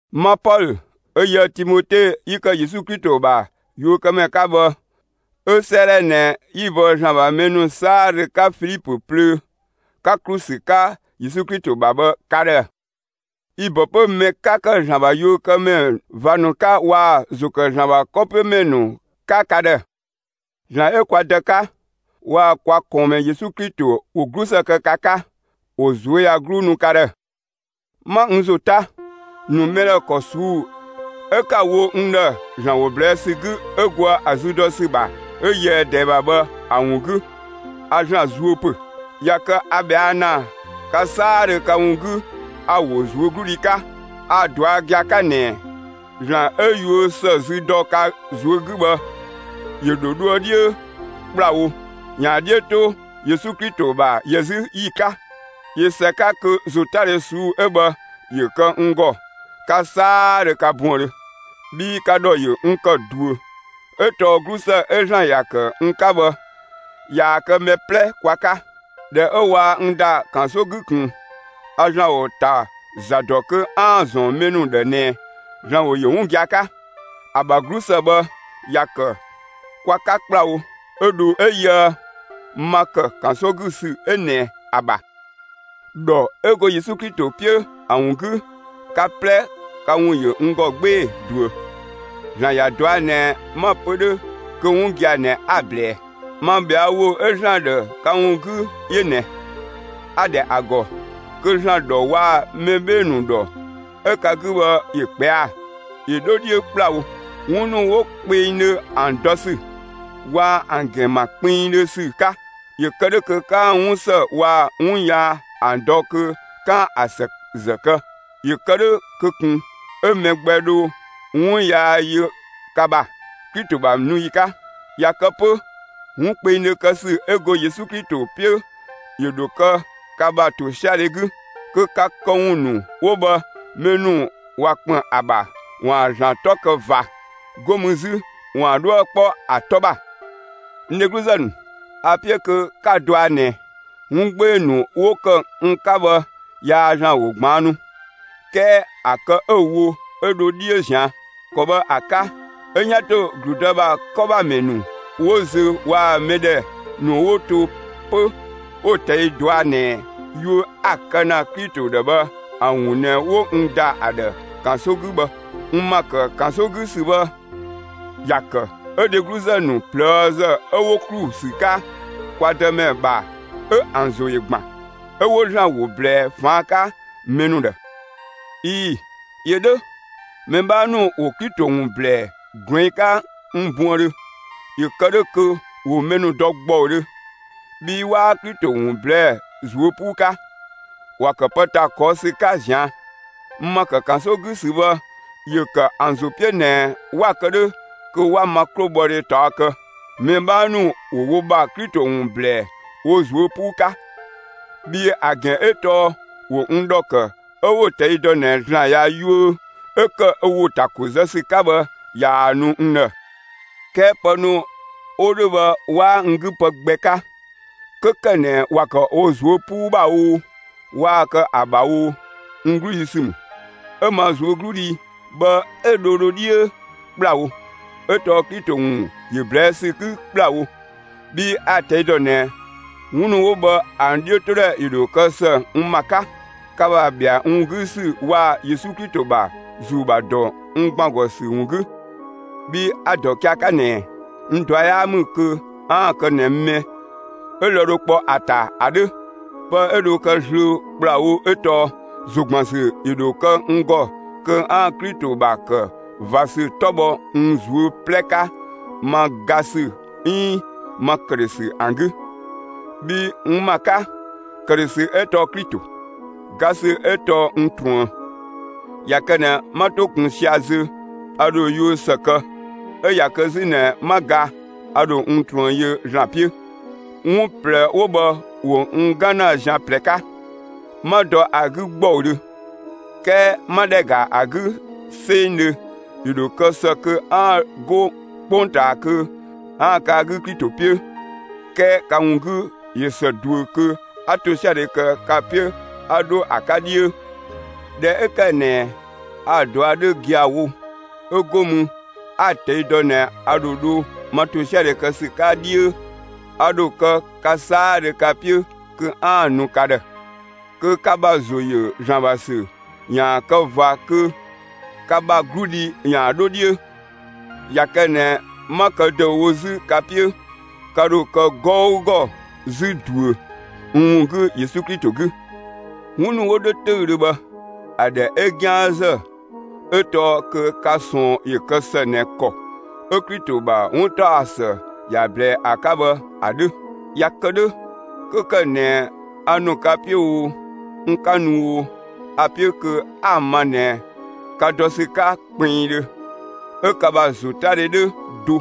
Ma Pɔlö, 'ö yië‑ Timote 'yi ‑kë Yesu Klito ‑bha yuökëmɛ 'ka bhë, 'ö 'sëëdhɛ ꞊nɛ 'yi‑ bɔ ‑Zlan ‑bha mɛ ‑nu 'saadhö 'ka Filipö plöö, 'ka ‑klu ‑sü 'ka Yesu Klito ‑bha bhë ka ‑dhë. Yi‑ ‑bɔ 'pö mɛ 'ka ‑kë ‑Zlan ‑bha yuökëmɛ ꞊va ‑nu 'ka waa‑ ‑zo ‑kë ‑Zlan ‑bha 'kɔ 'piö ‑mɛ ‑nu 'ka ka ‑dhë. ‑Zlan 'ö kwa Dë 'ka, waa‑ kwa ꞊kɔɔnmɛ Yesu Klito, ‑wo 'glusë kë ka 'ka, ‑wo ꞊zuöyagluu nu ka ‑dhë! 'Ma n ‑zo 'ta, ‑nu mɛ ‑dhë ‑kɔ ꞊suu'‑ 'ö 'kaa‑ wo n ‑dhë ‑Zlan ‑wo ꞊blɛɛ' ‑sü 'gü 'ö goë ‑a zü dɔ ‑sü ‑bha 'ö yöë ꞊dɛɛ ‑bha bhë ‑a ‑wun 'gü, a ‑Zlan zuö ‑pö. ꞊Ya kë a ꞊bhɛa' ‑na ka 'saadhö ka ‑wun 'gü, a‑ ‑wo ꞊zuögludhi 'ka. A‑ ꞊dɔa' gia‑ 'ka ꞊nɛ, ‑Zlan 'ö yuö ‑së zü dɔ ka ꞊zuö' 'gü bhë, ‑yö ‑dho dhoë 'dhiö ‑kplawo, ‑yaan ‑a 'dhiö 'to Yesu Klito ‑bha ‑yɛ 'zü ‑yi 'ka. ꞊Yö ‑së 'ka kö ‑zotadhe ꞊suu'‑ 'ö bhë ‑yö kë n ‑gɔ, ka 'saadhö ka buëndhö. Bhii ka ‑dhɔ ‑yö n ‑kë ꞊duö. 'Ö tɔɔ 'glusë 'ö ‑Zlan ‑ya ‑kë n 'ka bhë, ꞊yaa‑ kë mɛ 'plɛ kwa 'ka. ꞊Dhɛ 'ö waa n ‑da ‑kanso 'gü ꞊kun, a ‑Zlan ‑wo ‑ta ‑za ‑dɔ kö 'aan‑ ‑zɔn mɛ ‑nu ‑dhë ꞊nɛ ‑Zlan ‑wo ‑yö 'wun gia‑ 'ka. ‑A ‑bha 'glusë bhë, ‑ya ‑kë kwa 'ka ‑kplawo, 'ö dho 'ö yöë ma ‑kë ‑kanso 'gü ‑sü 'ö ꞊nɛ ‑a ‑bha. ‑Dhɔ 'ö go Yesu Klito 'piö ‑a ‑wun 'gü, ka 'plɛ, ka ‑wun ‑yö n ‑gɔ 'gbee‑ ꞊duö. ‑Zlan ‑ya ꞊dɔa' ꞊nɛ 'ma‑ pö 'dhö kö 'wun gia‑ ꞊nɛ 'a‑ ꞊blɛɛ. Ma ꞊bhɛa' ‑wo 'ö ‑Zlan ‑dhë ka ‑wun 'gü 'yö ꞊nɛ: A‑ ‑dhɛ ‑a ‑gɔ kö ‑Zlan ‑dhɔ waa‑ mɛ 'bhee‑ ‑nu ‑dhɔ 'ö ka 'gü bhë ‑yö ꞊kpɛa'‑, ‑yö 'dho 'dhiö ‑kplawo, 'wun ‑nu 'wo kpengdhö ‑an dɔ ‑sü, waa‑ ‑an ‑gɛn ‑ma kpinngdhö ‑sü 'ka. ‑Yö kë 'dhö kö 'kaan‑ 'wun ‑së waa‑ 'wun yaa ‑an dɔ kö 'kaan‑ ‑a ‑së ‑zë kë. ‑Yö kë 'dhö kö ꞊kun 'ö mɛ gbɛ dho 'wun yaa yö ka ‑bha, Klito ‑bha nu ‑yi 'ka. ꞊Ya kë 'pö, 'wun kpengdhö kë ‑sü 'ö go Yesu Klito 'piö ‑yö ‑dho kë ka ‑bha ‑tosiadhe 'gü; kö ka këwun ‑nu 'wo bhë, mɛ ‑nu ꞊wa ‑kpën ‑a ‑bha, ‑waan ‑Zlan 'tɔ kë ꞊va. 'Go mü 'zü ‑waan 'dhuë‑ 'kpɔ ‑a 'tɔ ‑bha. N dhegluzë ‑nu, a‑ 'piö kö 'ka‑ dɔa ꞊nɛ, 'wun 'gbee‑ ‑nu 'wo ‑kë n 'ka bhë yaa ‑Zlan ‑wo ꞊gbaannu 'kɛɛ ‑a kë 'ö‑ wo 'ö dho 'dhiö ꞊zian'. ‑Kɔ bhë ‑a 'ka, 'ö 'yan ‑to ‑gludë ‑bha 'kɔ ‑bha ‑mɛ ‑nu 'wo zö waa‑ mɛ ‑dhɛ ‑nu 'wo to 'pö 'wo‑ ꞊tɛi' dɔa ꞊nɛ yuö 'a‑ kë ‑na Klito ‑dhë bhë ‑a ‑wun ꞊nɛ 'wo n ‑da ‑a ‑dhë ‑kanso 'gü bhë. N ‑ma ‑kë ‑kanso 'gü ‑sü bhë, ‑ya ‑kë 'ö dhegluzë ‑nu ꞊plëëzë 'ö 'wo ‑klu ‑sü 'ka kwa Dëmɛ ‑bha 'ö ‑an ‑zo ‑yö ‑gban; 'ö 'wo ‑Zlan ‑wo ꞊blɛɛ ꞊faan' 'ka mɛ ‑nu ‑dhë. ꞊Ii‑, ‑yö 'dhö! Mɛ 'bhaa ‑nu ‑wo Klito ‑wun ‑blɛɛ ꞊gluɛng' 'ka n buëndhö, ‑yö kë 'dhö kö ‑wo mɛ ‑nu dɔ ‑gbɔudhö. Bhii 'waa Klito ‑wun ꞊blɛɛ'‑ ꞊zuö' 'puu 'ka; ‑wa ‑kë pë ‑ta ꞊kɔɔ' ‑sü 'ka ꞊zian'. N ‑ma ‑kë ‑kanso 'gü ‑sü bhë ‑yö ‑kë ‑an ‑zo 'piö ꞊nɛ 'wa‑ kë 'dhö kö 'wa ma 'klobhɔdhe ꞊taɔ' kë. Mɛ 'bhaa ‑nu ‑wo wo ‑bha Klito ‑wun ‑blɛɛ wo ꞊zuö' 'puu 'ka. Bhii ‑a ‑gɛn 'ö tɔɔ ‑wo n ‑dhɔ ‑kë 'ö 'wo‑ ꞊tɛi' dɔ ꞊nɛ ‑Zlan ꞊ya yuö 'ö ‑kë ö ‑wo ‑ta ‑ko zë ‑sü 'ka bhë ꞊yaa‑ nu n ‑dhë. 'Kɛɛ pë ‑nu 'wo 'dhö bhë 'waa n 'gü pë gbɛ 'ka. 'Kö ‑kë ꞊nɛ ‑wa ‑kë wo ꞊zuö' 'puu ‑bha oo waa‑ kë ‑a ‑bha oo, n 'gludhi ‑sü ‑mü; 'ö ma ꞊zuögludhi bhë 'ö dho dho 'dhiö ‑kplawo, 'ö tɔɔ Klito ‑wun ‑yö ꞊blɛɛ' ‑sü 'gü ‑kplawo. Bhii a‑ ꞊tɛi' dɔ ꞊nɛ, 'wun ‑nu 'wo bhë ‑an 'dhiötodhɛ ‑yö ‑dho kë ‑së n ‑ma 'ka, ka ‑bha ‑bhɛa n ‑wun 'gü ‑sü waa‑ Yesu Klito ‑bha ‑Zuu ‑bha ‑dɔ n ‑gban ‑gɔ ‑sü ‑wun 'gü. Bhii a‑ ‑dɔ gia‑ 'ka ꞊nɛ, n ꞊dua' 'yaa ‑mü kö 'aan‑ kë ꞊nɛ mɛ 'ö lë‑ dho 'kpɔ ‑a ‑ta ‑a 'dhö. Pë 'ö dho kë zlöö ‑kplawo 'ö tɔɔ: ‑Zo ‑gban ‑sü 'yö dho kë n ‑gɔ kö 'aan‑ Klito ‑bha ‑kë ꞊va ‑sü 'tɔ bhɔ n ꞊zuö' 'plɛ 'ka ma ga ‑sü 'iin ma ‑këdhösü ‑an 'gü. Bhii n ‑ma 'ka, ‑këdhösü 'ö tɔɔ Klito, ga ‑sü 'ö tɔɔ n ꞊truën. ꞊Ya kë ꞊nɛ 'ma 'to ꞊kun 'sia‑ zö, a ‑dho yuö ‑së kë; 'ö ꞊ya kë 'zü ꞊nɛ 'ma ga, a ‑dho n ꞊truën yö ‑Zlan 'piö. 'Wun ꞊plɛ 'wo bhë ‑wo n 'gan ‑na zian ꞊plɛ 'ka, 'ma dɔ ‑a 'gü ‑gbɔudhö. 'Kɛɛ 'ma ‑dhɛ ‑ga ‑a 'gü 'sengdhö, ‑yö ‑dho kë ‑së kö 'aan‑ 'go 'kpongtaa kö 'aan‑ kë ‑a 'gü Klito 'piö. 'Kɛɛ ka ‑wun 'gü ꞊yö ‑së ꞊duö kö 'a ‑tosiadhe kë ka 'piö 'a dho ‑a 'ka 'dhiö. ꞊Dhɛ 'ö ‑kë ꞊nɛ a‑ ꞊dua' 'dhö gia‑ wo, 'ö 'go mü 'a‑ ꞊tɛi' dɔ ꞊nɛ a ‑dho dho ma ‑tosiadhe kë ‑sü 'ka 'dhiö, a ‑dho kë ka 'saadhö ka 'piö kö 'aan‑ nu ka ‑dhë, kö ka ‑bha ‑zo ‑yö ‑Zlan ‑bha ‑sü ‑yaan kë ꞊va kö ka ‑bha 'gludhi ‑yaan 'dho 'dhiö. ꞊Ya kë ꞊nɛ 'ma kë ‑dëüwo 'zü ka 'piö, ka ‑dho kë 'gɔugɔ 'zü ꞊duö n ‑wun 'gü Yesu Klito 'gü. 'Wun ‑nu 'wo 'dhö 'töüdhö bhë, ‑a ‑dhɛ 'ö 'gianzë 'ö tɔɔ kö ka ꞊sɔɔn ‑yö kë ‑së ꞊nɛ ‑kɔ 'ö Klito ‑bha 'wuntaɔsë ‑ya ꞊blɛɛ ‑a 'ka bhë ‑a 'dhö. ꞊Ya kë 'dhö, 'kö ‑kë ꞊nɛ a ‑nu ka 'piö oo, n 'ka nu oo, a‑ 'piö kö 'a‑ ma ꞊nɛ ka dɔ ‑sü 'ka kpinngdhö, 'ö ka ‑bha ‑zotadhe 'dhö do,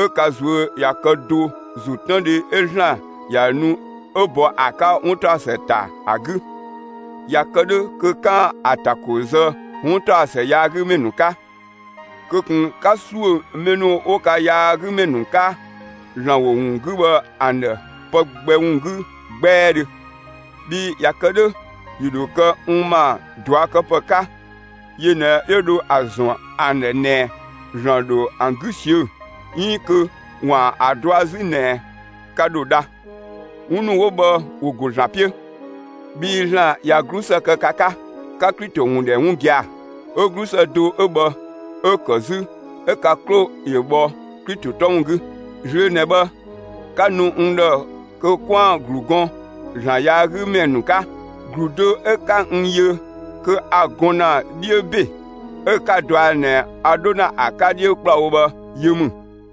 'ö ka ꞊zuö' ꞊ya kë do ‑zotëndhe 'ö ‑Zlan ‑ya nu 'ö bɔ ‑a 'ka 'wuntaɔsë ‑ta ‑a 'gü. ꞊Ya kë 'dhö kö 'kaan‑ ‑a ‑ta ‑ko zë 'wuntaɔsë yaagümɛ ‑nu 'ka. Kö ꞊kun 'ka ‑suö mɛ ‑nu 'wo ka yaagümɛ ‑nu 'ka ‑Zlan ‑wo ‑wun 'gü bhë ‑an ‑dhë pë gbɛ ‑wun 'gü 'gbɛɛdhö! Bhii ꞊ya kë 'dhö, ‑yö ‑dho kë ‑an ‑bha ꞊duakëpë 'ka, yö ꞊nɛ 'yö dho ‑a ‑zɔn ‑an ‑dhë ꞊nɛ ‑Zlan ‑dho ‑an 'gü ꞊siö'‑, 'iin kö ‑waan ‑a ꞊dua' 'zü ꞊nɛ, ka ‑dho dha. 'Wun ‑nu 'wo bhë ‑wo ‑go ‑Zlan 'piö. Bhii ‑Zlan ꞊ya 'glusë kë ka 'ka; 'ka Klito ‑wun ‑dhɛ 'wun gia‑. 'Ö 'glusë do 'ö bhë 'ö‑ ‑kë 'zü 'ö ka 'klo ‑yö bhɔ Klito 'tɔ ‑wun 'gü. Zlöö ꞊nɛ bhë 'ka nu n ‑dhë kö 'kwaan‑ ‑glu gɔn ‑Zlan yaagümɛ ‑nu 'ka. ‑Glu do 'ö 'ka n yö kö a‑ gɔn ‑na 'dhiö ‑be, 'ö 'ka‑ dɔa ꞊nɛ a 'dho ‑na ‑a 'ka 'dhiö ‑kplawo bhë, yö ‑mü.